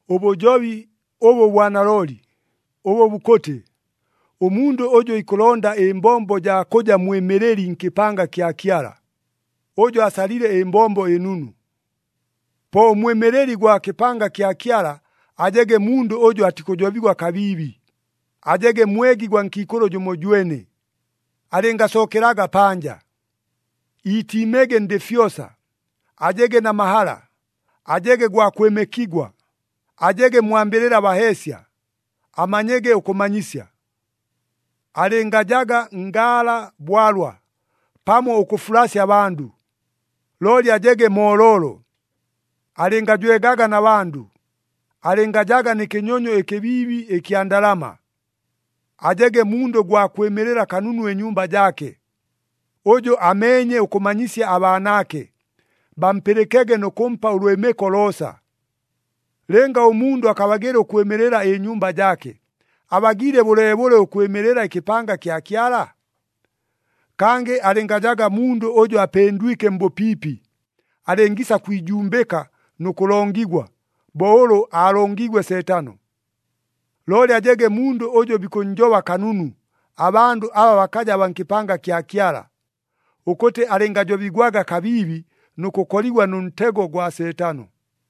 Ʉbʉjobi ʉbʉ bwa nalooli, ʉbʉ bukʉtɨ, “Ʉmundʉ ʉjʉ ikʉlonda ɨmbombo jaa kʉja mwɨmɨlɨli nkɨpanga kya Kyala, ʉjo asalile ɨmbombo ɨnunu.” Po ʉmwɨmɨlɨli gwa kɨpanga kya Kyala ajege mundʉ ʉjʉ atikʉjobigwa kabiibi, ajege mwegi gwa nkiikʉlʉ jʉmojwene, alɨngasookelaga panja. Iitiimege ndɨ fyosa, ajege na mahala, ajege gwa kwɨmɨkigwa, ajege mwambɨlɨla baheesya, amanyege ʉkʉmanyisya. Alɨngajaga ngaala bwalwa pamo ʉkʉfulasya abandʉ, looli ajege mooloolo, alɨngajwegaga na bandʉ, alɨngajaga nɨ kɨnyonyo ɨkɨbiibi ɨkya ndalama. Ajege mundʉ gwa kwɨmɨlɨla kanunu ɨnyumba jaake, ʉjʉ ameenye ʉkʉmanyisya abaanaake, bampɨlɨkege nʉ kʉmpa ʉlwɨmɨko loosa. Lɨnga ʉmundʉ akabagɨla ʉkwɨmɨlɨla ɨnyumba jaake, abagiile bʉleebʉle ʉkwɨmɨlɨla ɨkɨpanga kya Kyala? Kangɨ alɨngajaga mundʉ ʉjʉ apɨndwike mbʉpiipi, alɨngiisa kwijumbɨka nʉ kʉlongigwa, bo ʉlʉ aalongiigwe Seetano. Looli ajege mundʉ ʉjʉ bikʉnnjoba kanunu abandʉ aba bakaja baa nkɨpanga kya Kyala, ʉkʉtɨ alɨngajobigwaga kabiibi nʉ kʉkoligwa nʉ ntego gwa Seetano.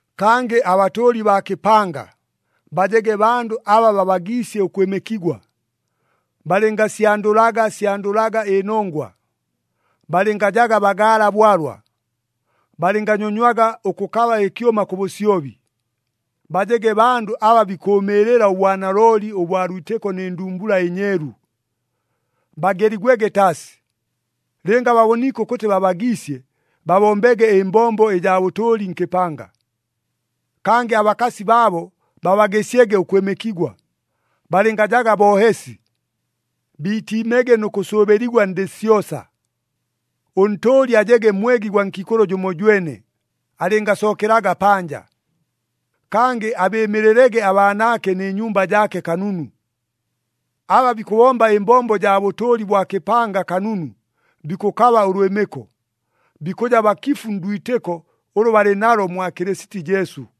Kangɨ abatʉʉli baa kɨpanga bajege bandʉ aba babagiisye ʉkwɨmɨkigwa, balɨngasyandʉlaga syandʉlaga ɨnongwa, balɨngajaga bagaala bwalwa, balɨnganyonywaga ʉkʉkaba ɨkyʉma kʉ bʉsyobi. Bajege bandʉ aba bikʉʉmɨɨlɨla ʉbwanalooli ʉbwa lwitɨko nɨ ndumbula ɨnyeelu. Bageligwege taasi. Lɨnga baboniike ʉkʉtɨ babagiisye, babombege ɨmbombo ɨjaa bʉtʉʉli nkɨpanga. Kangɨ abakasi baabo babagɨsyege ʉkwɨmɨkigwa, balɨngajaga boohesi. Biitiimege nʉ kʉsʉʉbɨligwa ndɨ syosa. Ʉntʉʉli ajege mwegi gwa nkiikʉlʉ jʉmojwene, alɨngasookelaga panja. Kangɨ abɨɨmɨlɨlege abaanaake nɨ nyumba jaake kanunu. Aba bikʉbomba ɨmbombo jaa bʉtʉʉli bwa kɨpanga kanunu, bikʉkaba ʉlwɨmɨko. Bikʉja bakifu ndwitɨko ʉlʉ balɨ nalo mwa Kɨlɨsiti Jesu.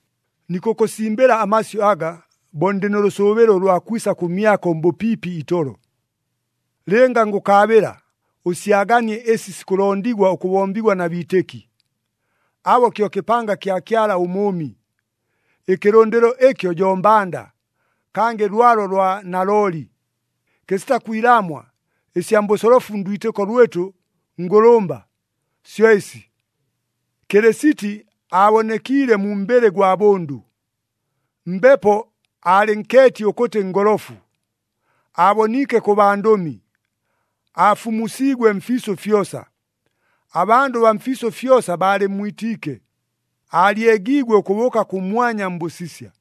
Nikʉkʉsimbɨla amasyʉ aga, bo ndɨ nʉ lʉsʉʉbɨlo ʉlwa kwisa kʉmyako mbʉpiipi itolo. Lɨnga ngʉkaabɨla, ʉsyaganie ɨsi sikʉlondigwa ʉkʉbombigwa na biitɨki. Abo kyo kɨpanga kya Kyala ʉMʉʉmi. Ɨkɨlʉndɨlo ɨkyo jo mbanda, kangɨ lwalo lwa nalooli. Kɨsita kwilaamwa, ɨsya mbʉsolofu ndwitɨko lwɨtʉ ngʉlʉmba, syo ɨsi, Kɨlɨsiti aabonekiile mu mbɨlɨ gwa bʉndʉ, Mbepo alɨ nkeeti ʉkʉtɨ ngolofu, aaboniike kʉ bandʉmi, aafumusiigwe mfiisʉ fyosa, abandʉ baa mfiisʉ fyosa baalɨmmwitiike, aalyegiigwe ʉkʉbʉʉka kʉmwanya mbʉsisya.